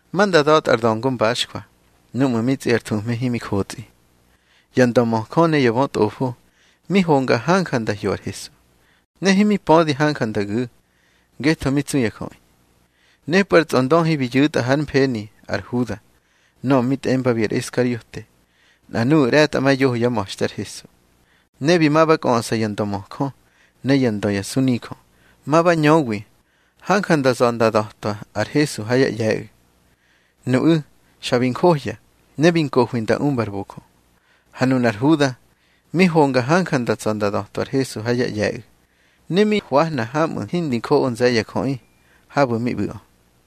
Ma nda da̱tꞌa ar da̱ngo mbaxjwa núꞌmu̱ mi tsꞌi ar thuhme himi jotsꞌi. Ya ndömöjö ne ya bötꞌofo mi honga hanja nda hyo ar Hesu, ne himi pödi hanja nda gu̱, ngetho mi tsu ya jöꞌi. Nepꞌu̱ ar tsꞌondöhi bi yu̱tꞌa hár mfeni ar Huda, nöꞌö mi tꞌembabi ar Iskariote, nꞌa nuꞌu̱ ꞌre̱tꞌamayoho yá ma̱xte ar Hesu. Ne bi ma ba kꞌöꞌsa ya ndömöjö ne yá ndö ya sunijö, ma ba ñöwi hanja nda za̱ nda da̱twa ar Hesu ha yá ꞌye̱ꞌu̱. Nuꞌu̱ xa bi njohya, ne bi nkohi nda umba ar bojö. Ha nunar Huda mi honga hanja nda tsa̱ nda da̱twa ar Hesu ha yá ꞌye̱ꞌu̱, ne mi hwahna haꞌmu̱ hindi njoꞌo nze̱ ya jöꞌi habu̱ mi ꞌbu̱ꞌö.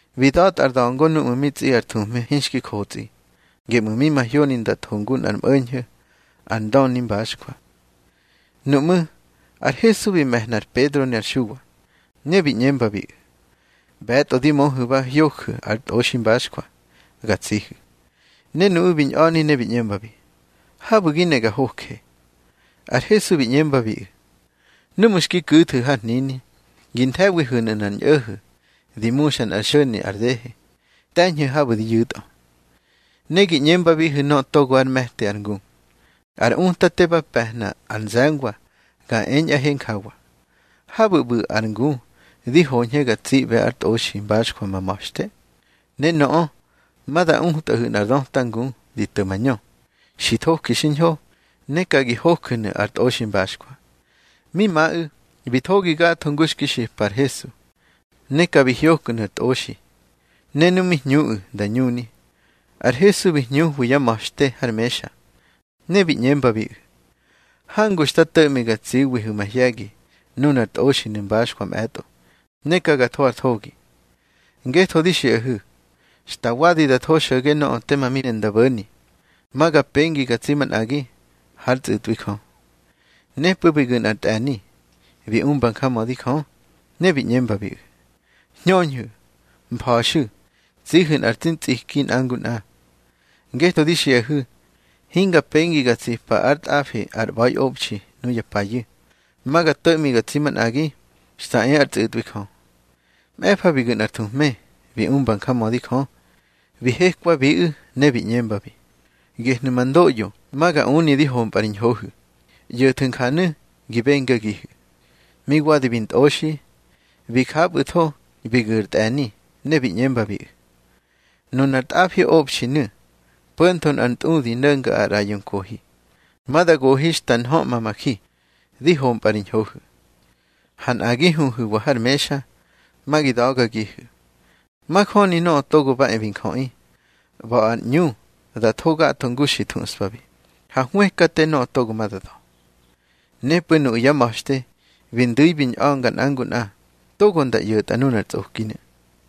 Bi da̱tꞌa ar da̱ngo núꞌmu̱ mi tsꞌi ar thuhme hinxki jotsꞌi, geꞌmu̱ mi mahyoni nda tho ngu nꞌar mꞌo̱ñho̱ ar ndöni mbaxjwa. Nuꞌmú̱ ar Hesu bi me̱hna ar Pedro ne ar Xuwa, ne bi ꞌñembabiꞌu̱: —ꞌBe̱tꞌo di möhu̱ ba hyoju̱ ar tꞌoxi mbaxjwa ga tsihu̱. Ne nuꞌu̱ bi ñꞌa̱ni ne bi ꞌñembabi: —Habu̱ gi ne ga hoje. Ar Hesu bi ꞌñembabiꞌu̱: —Núꞌmu̱ xki ku̱thu̱ har hnini, gi nthe̱wihu̱nu̱ nꞌar ñꞌo̱ho̱ di muxa nꞌar xo̱ni ar dehe. Te̱ñhu̱ habu̱ di yu̱tꞌö. Ne gi ꞌñembabihu̱ nöꞌö togo ár me̱ti ar ngu: Ar Utate ba pe̱hna ar nze̱ngwa ga eñꞌahe njawa: Habu̱ ꞌbu̱ ar ngu di hoñhe ga tsiꞌbe ar tꞌoxi mbaxjwa ma ma̱xte. Ne nöꞌö ma da utꞌahu̱ nꞌar döta ngu di to̱ mañö, xi thoki xiñho, ne ka gi hoju̱nu̱ ar tꞌoxi mbaxjwa. Mi maꞌu̱, bi thogi gatho ngu xki xipa ar Hesu. Ne ka bi hyoknu̱ ar tꞌoxi. Ne nu mi hñuꞌu̱ nda ñuni, ar Hesu bi hñuhwi yá ma̱xte har mexa. Ne bi ꞌñembabiꞌu̱: —Hangu xta to̱ꞌmi ga tsiwihu̱ mahye̱gi nunar tꞌoxinu̱ mbaxjwa mꞌe̱tꞌo, ne ka ga tho ar thogi. Ngetho di xiꞌahu̱, xta wadi da tho xo̱ge nöꞌö tema mi ne nda bo̱ni, ma ga pengi ga tsi manꞌagi hár tsꞌu̱tꞌwi Jö. Nepꞌu̱ bi gu̱ nꞌar tꞌe̱ni, bi umba njamödi Jö, ne bi ꞌñembabiꞌu̱: —Hñöñhu̱, mfa̱xu̱ tsihu̱ nꞌar tsi ntsiki nꞌa ngu nꞌa. Ngetho di xiꞌahu̱, hinga pengi ga tsipa ár tꞌafi ar ꞌba̱iꞌobxi nuya payu̱. Ma ga to̱ꞌmi ga tsi manꞌagi xta e ár tsꞌu̱tꞌwi Jö. Mꞌe̱fa bi gu̱ nꞌar thuhme, bi umba njamödi Jö, bi hekwabiꞌu̱ ne bi ꞌñembabi: —Gehnu̱ ma ndoꞌyo ma ga uni di hompꞌa ri ñhohu̱. ꞌYo̱thu̱ njanu̱ gi bengagihu̱. Mi wadi bi ntꞌoxi, bi japꞌu̱tho bi gu̱ ar tꞌe̱ni, ne bi ꞌñembabiꞌu̱: —Nunar tꞌafiꞌobxinu̱, po̱ntho nꞌar ntꞌudi no̱nga ar ꞌraꞌyo nkohi, ma da gohi xta nhöꞌma ma ji, di hompꞌa ri ñhohu̱. Ha nꞌa gi huhu̱wa har mexa, ma gi da̱gagihu̱. Majöni Nöꞌö Togo ba e bi Njöꞌi, ꞌba̱ ar ꞌñu da tho gatho ngu xi thuꞌspabi, ha hwëkate nöꞌö togo ma da da̱. Nepꞌu̱ nuꞌu̱ yá ma̱xte bi ndu̱i bi ñꞌa̱nga nꞌa ngu nꞌa togo nda ꞌyo̱tꞌa nunar tsꞌokinu̱.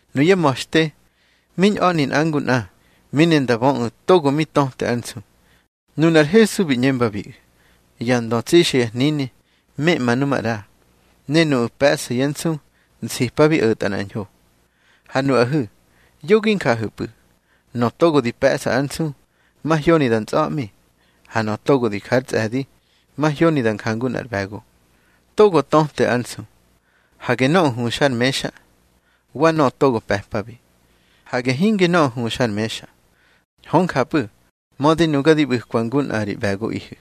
Nuyá ma̱xte mi ñꞌa̱ni nꞌa ngu nꞌa, mi ne nda böꞌu̱ togo mi töte ár nsu. Nunar Hesu bi ꞌñembabiꞌu̱: —Ya ndö tsixa ya hnini meꞌma nu maꞌra, ne nuꞌu̱ pe̱ꞌsa yá nsu nsipabi o̱tꞌa nꞌar ñho. Ha nuꞌahu̱, yo gi njahu̱pꞌu̱. Nöꞌö togo di pe̱ꞌsa ár nsu, mahyoni da ntsꞌa̱ꞌmi. Ha nöꞌö togo di ja ár tsꞌe̱di, mahyoni da njangu nꞌar ꞌbe̱go. Togo töte ár nsu. Hage nöꞌö huxa har mexa, wa nöꞌö togo pe̱pabi. Hage hinge nöꞌö huxa har mexa. Hö njapꞌu̱, mödi nuga di ꞌbu̱kwa ngu nꞌa ri ꞌbe̱gogihu̱.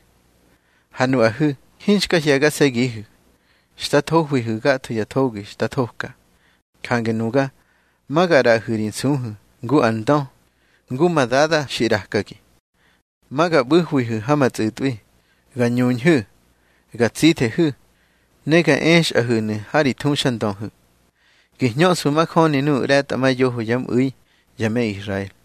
Ha nuꞌahu̱ hinxka hye̱gase̱gihu̱, xta thohwihu̱ gatho ya thogi xta thoka. Jange nuga ma ga ꞌraꞌahu̱ ri nsuhu̱ ngu ar ndö, ngu ma Dada xi ꞌrakagi. Ma ga ꞌbu̱hwihu̱ ha ma tsꞌu̱tꞌwi, ga ñuñhu̱, ga tsithehu̱, ne ga exꞌahu̱nu̱ ha ri thuxandöhu̱, gi hñöꞌsfu̱ majöni nuꞌu̱ ꞌre̱tꞌamayoho yá mꞌu̱i ya me Israel.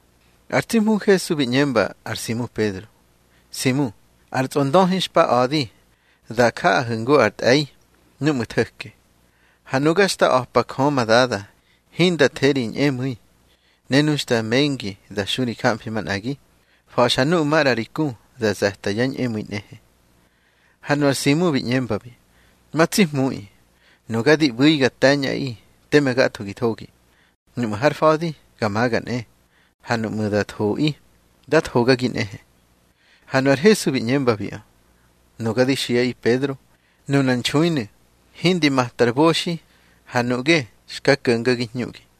Ar tsi Hmu Hesu bi ꞌñemba ar Simu Pedro: —Simu, ar tsꞌondöhi xpa a̱di da jaꞌahu̱ ngu ar tꞌe̱i núꞌmu̱ tho̱ke. Ha nuga xta a̱pa Jö ma Dada hinda the ri ñꞌemu̱i. Ne nu xta mengi da xu ri jamfi manꞌagi, fa̱xa nuꞌu̱ maꞌra ri ku da ze̱ta yá ñꞌemu̱i nꞌehe. Ha nu ar Simu bi ꞌñembabi: —Ma tsi Hmuꞌi, nuga di ꞌbu̱i ga te̱ñꞌaꞌi teme gatho gi thogi. Nuꞌmu̱ har fa̱di, ga maga nꞌe. Ha nuꞌmu̱ da thoꞌi, da thogagi nꞌehe. Ha nu ar Hesu bi ꞌñembabiꞌö: —Nuga di xiꞌaꞌi Pedro, nuna nxuinu̱, hindi mata ar boxi, ha nuꞌge xka ko̱ngagi hñuꞌgi.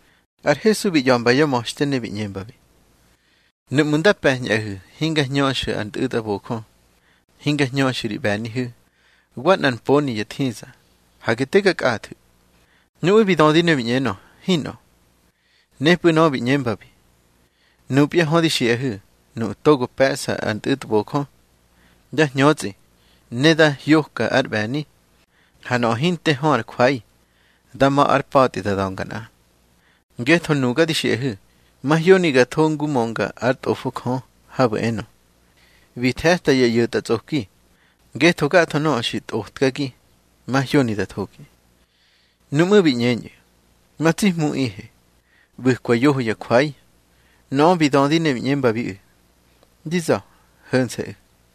Ar Hesu bi ꞌya̱mba yá ma̱xte, ne bi ꞌñembabi: —Núꞌmu̱ nda pe̱ñꞌahu̱, hinga hñöxu̱ ar ntꞌu̱tbojö, hinga hñöxu̱ ri ꞌbe̱nihu̱, wa nꞌar mponi ya thiza, hage te ga kꞌathu̱. Nuꞌu̱ bi dödi ne bi ꞌñenö: —Hinꞌö. Nepꞌu̱ nöꞌö bi ꞌñembabi: —Nupya hö di xiꞌahu̱, nuꞌu̱ togo pe̱ꞌsa ar ntꞌu̱tbojö, dá hñötsꞌi, ne dá hyoka ár ꞌbe̱ni. Ha nöꞌö hinte hö ár jwai, dá ma̱ ár pa̱tꞌi da da̱nga nꞌa. Ngetho nuga di xiꞌahu̱, mahyoni ga tho ngu mönga ár Tꞌofo Jö, habu̱ enö: Bi the̱ta ya ꞌyo̱tꞌatsꞌoki. Ngetho gatho nöꞌö xi tꞌotkagi, mahyoni da thogi. Nuꞌmú̱ bi ꞌñeñꞌu̱: —Ma tsi Hmuꞌihe, ꞌbu̱kwa yoho ya jwai. Nöꞌö bi dödi ne bi ꞌñembabiꞌu̱: —Di za̱, ho̱nse̱ꞌu̱.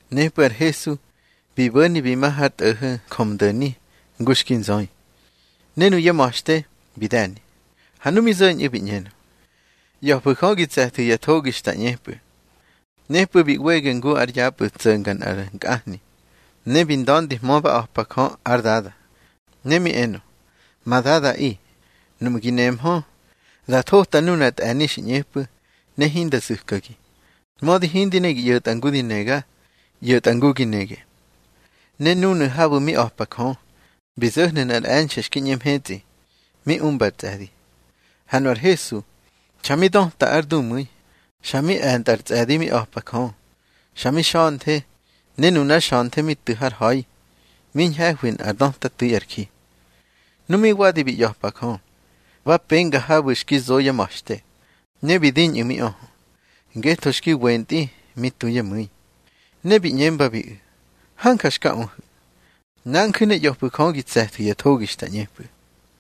Nepꞌu̱ ar Hesu bi bo̱ni bi ma har tꞌo̱ho̱ Njömdo̱ni ngu xki nzöi. Ne nuyá ma̱xte bi de̱ni. Ha nu mi zo̱ñꞌu̱, bi ꞌñenö: —ꞌYa̱fu̱ Jö gi tse̱thu̱ ya thogi xta ꞌñepꞌu̱. Nepꞌu̱ bi ꞌwege ngu ar yapꞌu̱ tso̱nga nꞌar nkꞌahni, ne bi nda̱ndihmö ba a̱pa Jö ár Dada. Ne mi enö: —Ma Dadaꞌi, nuꞌmu̱ gi nehmö, da thota nunar tꞌe̱ni xi ꞌñepꞌu̱ ne hinda zu̱kagi. Mödi hindi ne gi ꞌyo̱tꞌa ngu di nega, ꞌyo̱tꞌa ngu gi nege. Ne núnu̱ habu̱ mi a̱pa Jö, bi zo̱hnu̱ nꞌar e̱nxe̱ xki ꞌñe mhetsꞌi mi umba ar tsꞌe̱di. Ha nu ar Hesu xa mi döta ár dumu̱i, xa mi e̱ntꞌa ar tsꞌe̱di mi a̱pa Jö. Xa mi xa̱nthe, ne nunár xa̱nthe mi tu̱ har ha̱i, mi ñhe̱hwi nꞌár döta tu̱i ar ji. Nu mi wadi bi ꞌya̱pa Jö, ba penga habu̱ xki zo yá ma̱xte, ne bi diñꞌu̱ mi öhö, ngetho xki wentꞌi mi tu yá mu̱i. Ne bi ꞌñembabiꞌu̱: —Hanja xka öhu̱. Nanju̱ ne ꞌya̱fu̱ Jö gi tse̱thu̱ ya thogi xta ꞌñepꞌu̱.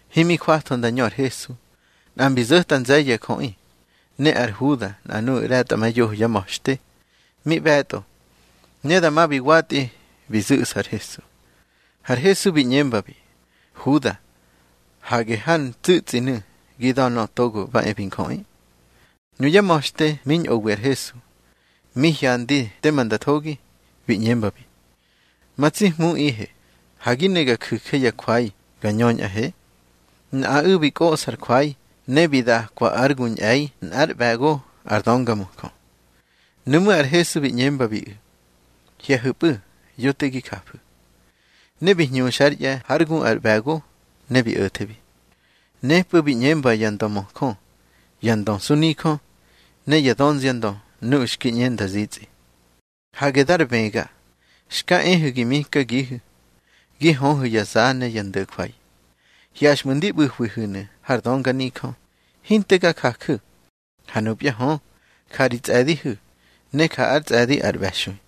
Himi jwatho nda ñö ar Hesu, nꞌa mbi zo̱ta nze̱ye̱ ya jöꞌi. Ne ar Huda, nꞌa nuꞌu̱ ꞌre̱tꞌamayoho yá ma̱xte, mi ꞌbe̱tꞌo, ne dama bi watꞌi bi zu̱ꞌsa ar Hesu. Har Hesu bi ꞌñembabi: —Huda, hage har ntsu̱tsꞌinu̱ gi da̱ Nöꞌö Togo ba e bi Njöꞌi. Nuyá ma̱xte mi ñꞌowi ar Hesu, mi hyandi tema nda thogi, bi ꞌñembabi: —Ma tsi Hmuꞌihe, ha gi ne ga ju̱je ya jwai ga ñöñꞌahe. Nꞌaꞌu̱ bi kꞌoꞌsa ar jwai, ne bi dakwa ár gu ñꞌe̱i nꞌár ꞌbe̱go ar döngamöjö. Nuꞌmú̱ ar Hesu bi ꞌñembabiꞌu̱: —Hye̱hu̱pꞌu̱, yo te gi jafu̱. Ne bi hñuxa ár ꞌye̱ hár gu ar ꞌbe̱go, ne bi o̱thebi. Nepꞌu̱ bi ꞌñemba ya ndömöjö, ya ndö sunijö, ne ya dönziandö nuꞌu̱ xki ꞌñe nda zitsꞌi: —Hage dar bëga xka ehu̱ gi mikagihu̱, gi höhu̱ ya za ne ya ndo̱jwai. Hyaxꞌmu̱ ndi ꞌbu̱hwihu̱ har dönganijö, hinte ga jaju̱. Ha nupya hö, ja ri tsꞌe̱dihu̱, ne ja ár tsꞌe̱di ar ꞌbe̱xui.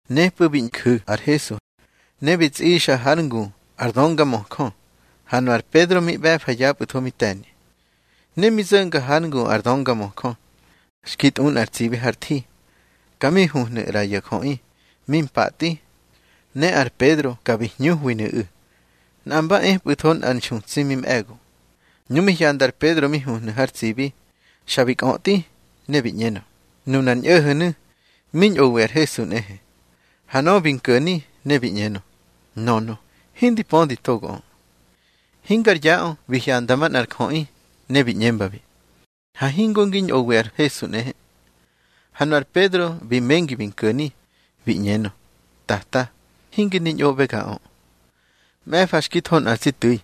Nepꞌu̱ bi nju̱ ar Hesu, ne bi tsꞌixa hár ngu ar döngamöjö. Ha nu ar Pedro mi ꞌbe̱fa yapꞌu̱tho, mi te̱ni. Ne mi zo̱nga hár ngu ar döngamöjö, xki tꞌu nꞌar tsibi har thi, ka mi huhnu̱ ꞌra ya jöꞌi mi mpatꞌi, ne ar Pedro ka bi hñuhwinu̱ꞌu̱. Nꞌa mba epꞌu̱tho nꞌar nxutsi mi mꞌe̱go. Nu mi hyanda ar Pedro mi huhnu̱ har tsibi, xa bi kꞌötꞌi, ne bi ꞌñenö: —Nunar ñꞌo̱ho̱nu̱ mi ñꞌowi ar Hesu nꞌehe. Ha nöꞌö bi nko̱ni, ne bi ꞌñenö: —Nönö, hindi pödi togoꞌö. Hingar yaꞌö bi hyanda manꞌar jöꞌi, ne bi ꞌñembabi: —Ha hingo ngi ñꞌowi ar Hesu nꞌehe. Ha nu ar Pedro bi mengi bi nko̱ni, bi ꞌñenö: —Tata, hinge ndi ñꞌoꞌbegaꞌö. Mꞌe̱fa xki tho nꞌa tsi tu̱i,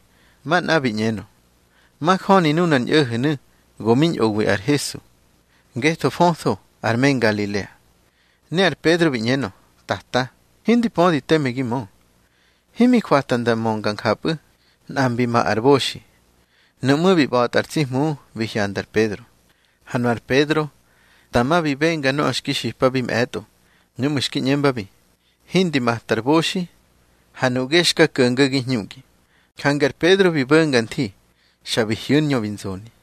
manꞌa bi ꞌñenö: —Majöni nunar ñꞌo̱ho̱nu̱ go mi ñꞌowi ar Hesu, ngetho fötho ar me Ngalilea. Ne ar Pedro bi ꞌñenö: —Tata, hindi pödi teme gi mö. Himi jwata nda mönga njapꞌu̱, nꞌa mbi ma ar boxi. Nuꞌmú̱ bi ꞌba̱tꞌa ar tsi Hmu bi hyanda ar Pedro. Ha nu ar Pedro dama bi benga nöꞌö xki xipabi mꞌe̱tꞌo, núꞌmu̱ xki ꞌñembabi: Hindi mata ar boxi, ha nuꞌge ya xka ko̱ngagi hñuꞌgi. Jange ar Pedro bi bo̱nga nthi, xa bi hyu̱ ár ñö bi nzoni.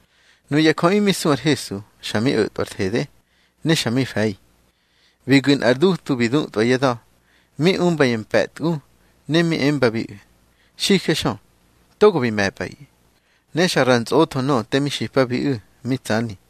Nuya jöꞌi mi su ar Hesu, xa mi o̱tꞌwa ar thede, ne xa mi fe̱i. Bi gu̱ nꞌar dutu bi dutꞌwa yá da̱, mi umba ya mpe̱tgu, ne mi embabiꞌu̱: —Xijexö, togo bi me̱pꞌaꞌi. Ne xa ra ntsꞌotho nöꞌö te mi xipabiꞌu̱, mi tsani.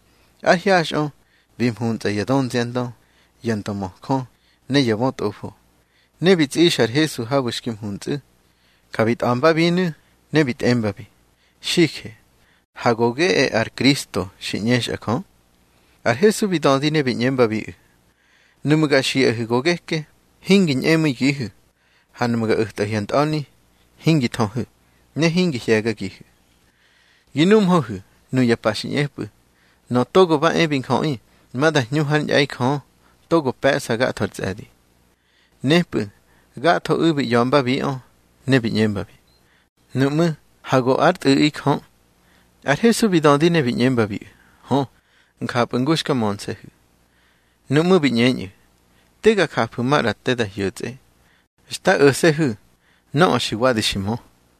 Ár hyaxꞌö bi mhuntsꞌa ya dönziandö, ya ndömöjö, ne ya bötꞌofo, ne bi tsꞌixa ar Hesu habu̱ xki mhuntsꞌu̱. Ka bi tꞌa̱mbabinu̱, ne bi tꞌembabi: —Xije, ha go geꞌe ar Kristo xi ꞌñexa Jö. Ar Hesu bi dödi ne bi ꞌñembabiꞌu̱: —Nuꞌmu̱ ga xiꞌahu̱ go geke, hingi ñꞌemu̱igihu̱. Ha nuꞌmu̱ ga o̱tꞌahu̱ ya ntꞌa̱ni, hingi thöhu̱, ne hingi hye̱gagihu̱. Gi numhöhu̱ nuya pa xi ꞌñepꞌu̱, Nöꞌö Togo ba e bi Njöꞌi ma da hñu hár ñꞌe̱i Jö togo pe̱ꞌsa gatho ar tsꞌe̱di. Nepꞌu̱ gathoꞌu̱ bi ꞌya̱mbabiꞌö, ne bi ꞌñembabi: —Nuꞌmú̱ ha go ár Tꞌu̱ꞌi Jö. Ar Hesu bi dödi ne bi ꞌñembabiꞌu̱: —Hö, njapꞌu̱ ngu xka mönse̱hu̱. Nuꞌmú̱ bi ꞌñeñꞌu̱: —Te ga jafu̱ maꞌra te da hyo̱tsꞌe. Xta o̱se̱hu̱ nöꞌö xi wadi xi mö.